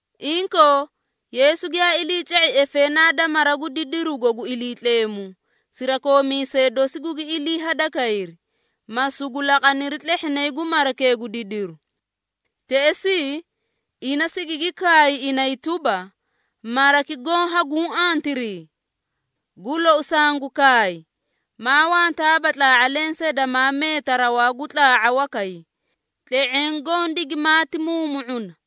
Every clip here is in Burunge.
Inkoo, Yeesu giyaa iliica⁄i efeenaa da mara gu didirugo gu Iliitleemu, sirakoomiisee dosi gugi ilii hadakayri, ma sugu laqaniri tlehhinay gu marakee gu didiru. Teꞌesii, ina sigigi kaay inay tuba, “Maraki goõ haguũ antirii? Gu lou sangu kaay, maa wantaaba tlaa⁄a lensee damaa meeta rawaa gu tlaa⁄a wakay, tle⁄eẽ goõ digimaati muumu⁄una.”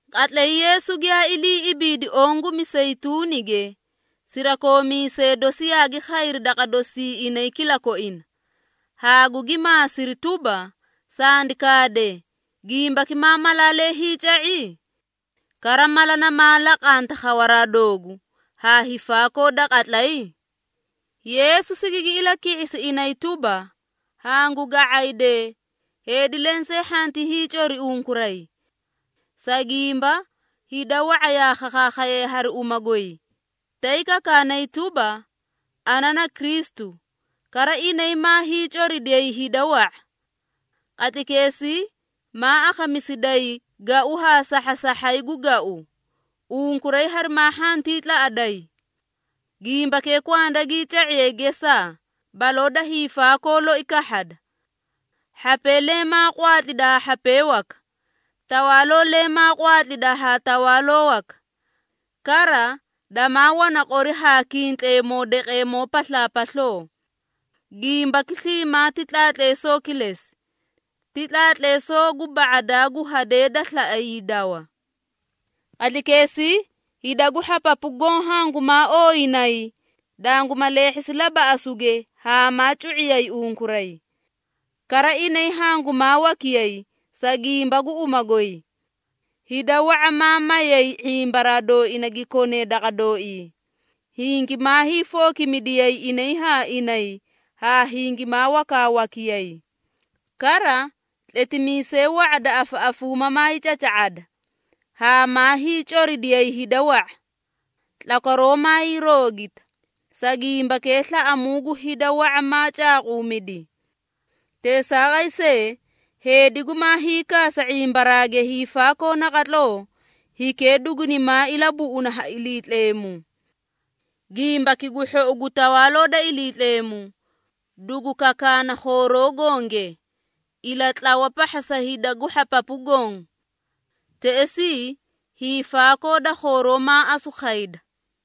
Qatlay Yeesu giyaa ilii ibiidi oõ gu Miseyituunige, sirakoomiisee dosi yaagi khayri daqa dosii inay kilakoina, haa gugi maasiri tuba, “Sandi kaade, gimbaki maa malaalee hiica⁄i? Kara mala namaa laqanta khawaraa doogu, haa hiifaakoo da qatlay?” Yeesu sigigi ilaki⁄isi inay tuba, “Hangu ga⁄aydee, heedi lensee hhanti hiicori unkuray. Sa gimba, hida wa⁄a yaa khakhayay hari uma goy, tay kakaanay tuba, ‘Ana na Kristu,’ kara inay maa hiicoridiyay hida wa⁄a. Qatlaykeesii maa akhamisidayi gau haa sahhasahhay gu gau, unkuray harimaa hhantii tlaꞌaday. Gimbakee kwanda gii ca⁄iye gesaa, baloo da hiifaakoo loi kahhada. Hhapee leẽ maa qwaatlida haa hhapee waka, tawaaloo leẽ maa qwaatlida haa tawaaloo waka. Kara, damaa wana qori haa kintleemoo daqeemoo paslaapasloo. Gimbaki sliimaa ti tlaatleesoo kilesi, ti tlaatleesoo gu ba⁄adaa gu hadee da slaꞌa hiidawa. Qatlaykeesii, hida gu hhapapu goõ hangumaa ooyinayi, danguma leehhisi labaꞌasuge haa maa cu⁄iyay unkuray. Kara inay hangumaa wakiyay, sa gimba gu uma goy. Hida wa⁄a maa mayay ⁄imbaraa dooina gi konee daqa dooii, hingimaa hiifookimidiyay inay haa inay haa hingimaa wakaawakiyay. Kara, tletimiisee wa⁄a da afaꞌafuuma maay caca⁄ada, haa maa hiicoridiyay hida wa⁄a. Tlakwaroo maay roogita, sa gimbakee slaꞌamuu gu hida wa⁄a maa caaquumidi. Teesaaqay see, heedi gumaa hiikaasa ⁄imbaraage hiifaakoo naqatloo, hikee dugunimaa ilabuꞌuna ha Iliitleemu. Gimbaki gu Hhou gu Tawaaloo da Iliitleemu, dugu kakaana khooroo gonge, ilatlawa pahha sa hida gu hhapapu goõ. Teꞌesii, hiifaakoo da khooroo maa asu khayda.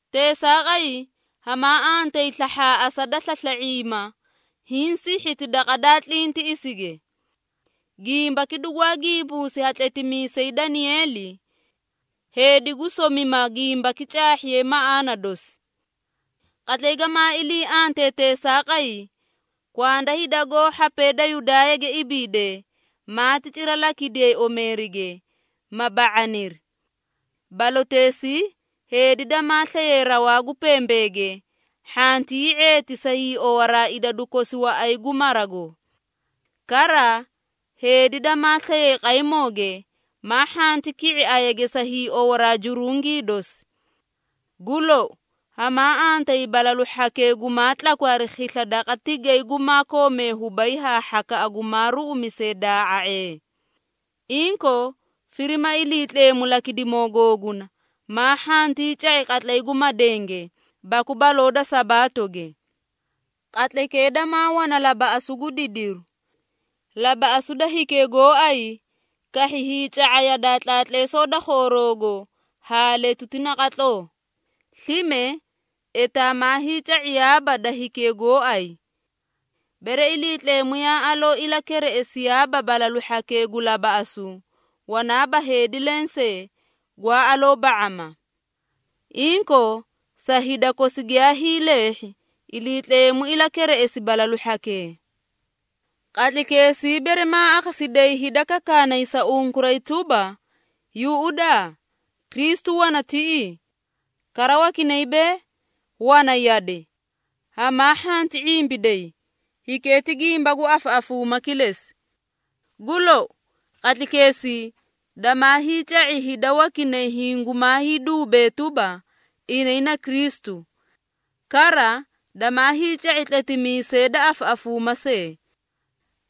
Teesaaqay, hamaa antayi slahhaaꞌasa da slasla⁄iima, hiĩ sihhiti daqa daa tlintiꞌisige. Gimbaki dugwaa gimbuusi ha tletimiisay Danieeli. Heedi gu somima gimbaki caahhiye maꞌaana dosi. Qatlay gamaa ilii antee teesaaqay, kwanda hida goó hhapee da Yudaayage ibiidee, maati cira lakidiyee omeerige, ma ba⁄aniri. Baloteesii, heedi damaa slaye rawaa gu pembeege, hhantii hii⁄eeti sa hiiowaraa idadu kosi waꞌay gu marago. Kara, heedi damaa slaye qaymooge, maa hhanti ki⁄i ayage sa hiiowaraa jurungii dosi. Gu lou, hamaa antayi balalu hhakee gumaa tlakwi hari khisla daqa tigay gumaa koomee hubay haa hhakaꞌa gumaa ruꞌumisee daa⁄a⁄ee! Inkoo, firima Iliitleemu lakidimoo googuna, maa hhantii ca⁄i qatlay gu madenge, baku baloo da Sabaatoge. Qatlaykee damaa wana labaꞌasu gu didiru. Labaꞌasu da hikee gooay kahhi hiica⁄a yadaa tlaatleesoo da khooroogo haa letuti naqatloo, slime etaa maa hiica⁄iyaaba da hikee gooay. Bere Iliitleemu yaa aloo ilakereꞌesiyaaba balalu hhakee gu labaꞌasu, wanaaba heedi lensee, gwaa aloo ba⁄ama. Inkoo, sa hida kosi giyaa hiileehhi, Iliitleemu ilakereꞌesi balalu hhakee. Qatlaykeesii, bere maa akhasidayi hida kakaanay sa unkuray tuba, ‘Yuꞌudaa! Kristu wana tiꞌii!’ Kara wakinay bee, ‘Wana yade!’ Hamaa hhanti ⁄imbiday, hikee ti gimba gu afaꞌafuuma kilesi. Gu lou, qatlaykeesii, damaa hiica⁄i hida wakinay hingumaa hiiduubee tuba, inay na Kristu. Kara, damaa hiica⁄i tletimiisee da afaꞌafuuma see.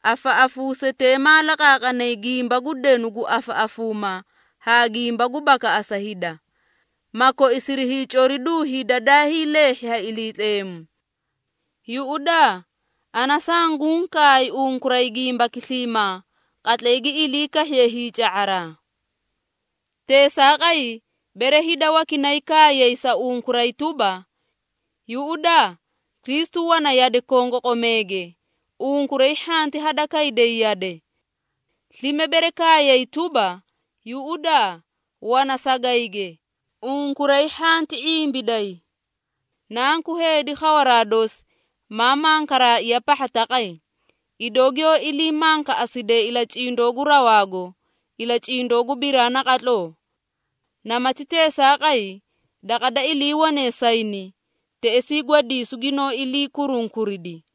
Afaꞌafuusetee maa laqaaqanay gimba gu denu gu afaꞌafuuma haa gimba gu bakaꞌasa hida, ma koisiri hiicoriduu hida daa hiileehhi ha Iliitleemu. Yuꞌudaa, ana sanguũ kaay unkuray gimbaki sliimaa, qatlay gi ilii kahhiye hiica⁄araa. Teesaaqay, bere hida wakinay kaayiyay sa unkuray tuba, ‘Yuꞌudaa, Kristu wana yade kongoqomeege,’ unkuray hhanti hada kayday yade. Slime bere kaayay tuba, ‘Yuꞌudaa, wana sagayge,’ unkuray hhanti ⁄imbiday. Nanku Heedi khawaraa dosi, maa mankaraaiya pahha taqay, idoo giyoó ilii mankaꞌaside ilacindoo gu rawaago, ilacindoo gu biraa naqatloo. Namati teesaaqay, daqa da iliiwane sayni, teꞌesii gwadiisu ginoó ilii kurunkuridi.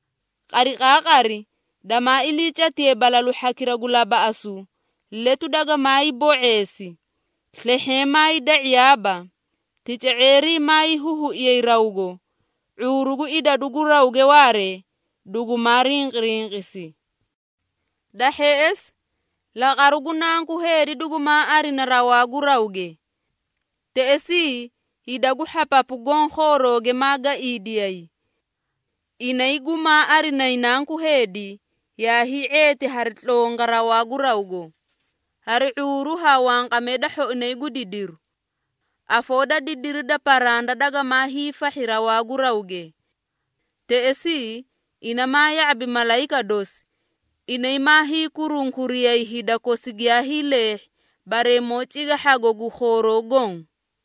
Qariqaaqari damaa iliicatiye balalu hhakira gu labaꞌasu, ‘Letu dagamaay bo⁄eesi. Slehheẽ maay da⁄iyaaba, tica⁄eerii maay huhuiyay rawgo, ⁄uuru gu idadu gu rawge waaree, dugumaa rinqirinqisi.’ Da hheꞌesi, laqaru gu Nanku Heedi dugumaa arina rawaa gu rawge. Teꞌesii, hida gu hhapapu goõ khoorooge maa gaiidiyay. Inay gumaa arinayi Nanku Heedi, yaa hii⁄eeti hari tlonga rawaa gu rawgo, hari ⁄uuru haa wanqamee da hhoinay gu didiru. Afoo da didiri da paranda dagamaa hiifahhi rawaa gu rawge. Teꞌesii, ina maa ya⁄abi malayika dosi, inay maa hiikurunkuriyay hida kosi giyaa hiileehhi, bareemoo cigahhago gu khooroo goõ.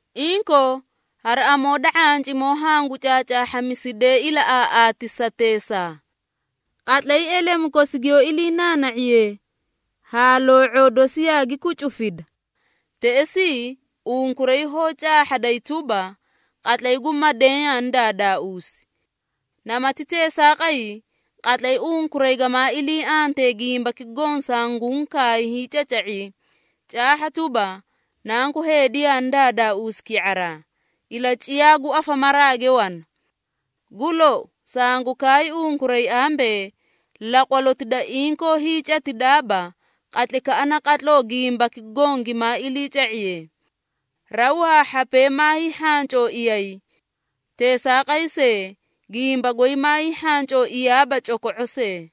Inkoo, hari amoo da ⁄ancimoo hangu caacaahhamisidee ilaꞌaaꞌaatisateesaa. Qatlay elemu kosi giyoó iliinaana⁄iyee haa loo⁄oo dosi yaagi kucufida, teꞌesii unkuray hoó caahhaday tuba, qatlay gu madeẽ yaani daadaauusi. Namati teesaaqay, qatlay unkuray gamaa ilii antee gimbaki goõ sanguũ kaay hiicaca⁄i, caahha tuba, Nanku Heedi yaani daadaauusi ki⁄araa, ilaciyaa gu afamaraage wana. Gu lou, sangu kaay unkuray ambee, laqwaloti da inkoo hiicatidaaba, qatlaykaꞌa naqatloo gimbaki goõ gimaa iliica⁄iye. Raw haa hhapee maa hiihhancooiyay. Teesaaqay see, gimba goy maa hiihhancooiyaaba coko⁄o see.”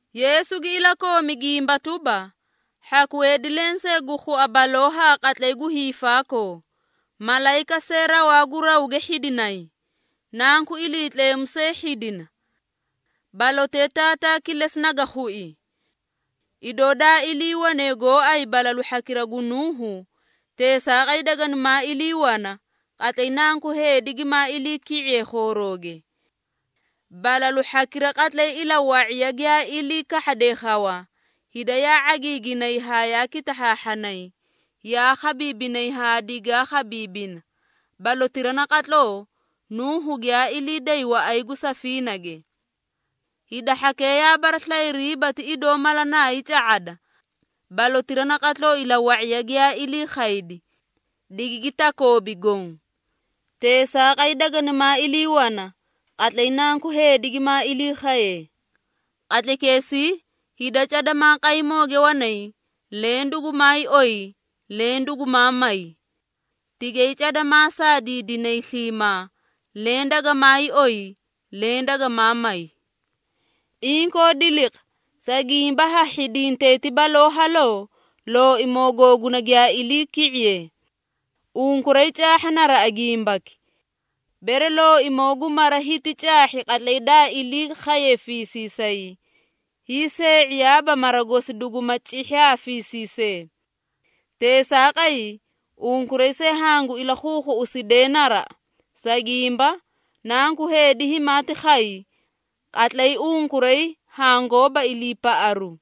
Yeesu gi ilakoomi gimba tuba, “Hhaku heedi lensee gu khua baloo haa qatlay gu hiifaakoo, malayika see rawaa gu rawge hhidinay, Nanku Iliitleemu see hhidina. Balotee Taataa kilesi naga khui. Idoo daa iliiwane gooay balalu hhakira gu Nuuhu, teesaaqay daganimaa ilii wana, qatlay Nanku Heedi gimaa iliiki⁄iye khoorooge. Balalu hhakira qatlay ilawa⁄iya giyaa ilii kahhade khawa, hida yaa ⁄agiiginay haa yaa kitahhaahhanay, yaa khabiibinay haa digaa khabiibina, balotira naqatloo, Nuuhu giyaa ilii day waꞌay gu safiinage. Hida hhakee yaa baraslayiriiba ti idoo mala naay ca⁄ada, balotira naqatloo ilawa⁄iya giyaa ilii khaydi, digigi takoobi goõ. Teesaaqay daganimaa ilii wana, qatlay Nanku Heedi gimaa ilii khaye. Qatlaykeesii, hida cada maa qaymooge wanay, leẽ dugumaay oyi, leẽ dugumaa may. Tigay cada maa saadiidinay sliimaa, leẽ dagamaay oyi, leẽ dagamaa may. Inkoo diliqa, sa gimba ha hhidintay ti baloo haloo, Looimoo googuna giyaa iliiki⁄iye. Unkuray caahha naraꞌa gimbaki. Bere looimoo gu mara hiti caahhi qatlay daa ilii khaye fiisiisay, hiisee⁄iyaaba mara gosi duguma cihhi ha fiisiisee. Teesaaqay, unkuray see hangu ilakhuukhuꞌusidee naraꞌa, sa gimba, Nanku Heedi himaati khay, qatlay unkuray hangoóba iliipaꞌaru.”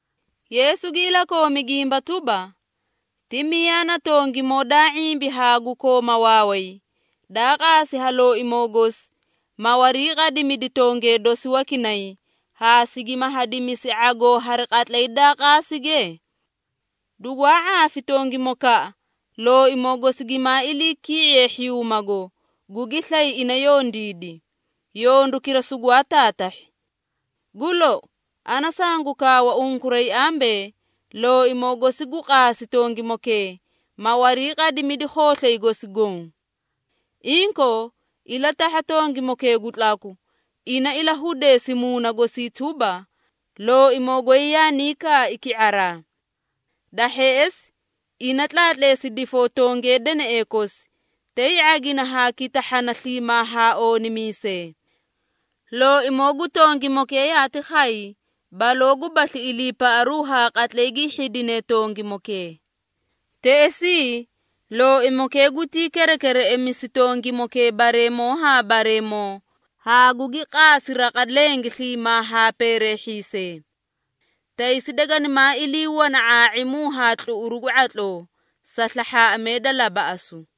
Yeesu gi ilakoomi gimba tuba, “Ti miyaa na tongimoo daa ⁄imbi haa gu kooma waaway, daa qaasi ha looimoo gosi, ma wariiqadimidi tongee dosi wakinay, haa sigima hadimisi ⁄agoo hari qatlay daa qaasige? Dugwaa ⁄aafi tongimokaꞌa, looimoo gosi gimaa iliiki⁄iye hhiyuumago, gugi slay ina yondiidi, yondukira sugwaa taatahhi. Gu lou, ana sangu kaawa unkuray ambee, looimoo gosi gu qaasi tongimokee, ma wariiqadimidi khooslay gosi goõ. Inkoo, ilatahha tongimokee gu tlaku, ina ilahudeesi muuna gosii tuba, ‘Looimoo goy yaanii kaai ki⁄araa.’ Da hheꞌesi ina tlaatleesi difoo tongee deneꞌee kosi, tay ⁄agina haa kitahhana sliimaa haa oonimiisee. Looimoo gu tongimokee yaati khay, baloo gubasli iliipaꞌaru haa qatlay gi hhidine tongimokee. Teꞌesii, looimokee gutii kerekereꞌemisi tongimokee bareemoo haa bareemoo, haa gugi qaasi raqa lenge sliimaa haa peereehhiisee. Taysi daganimaa ilii wana ⁄aa⁄imu haa tluꞌuru gu ⁄atloo, sa slahhaaꞌamee da labaꞌasu.”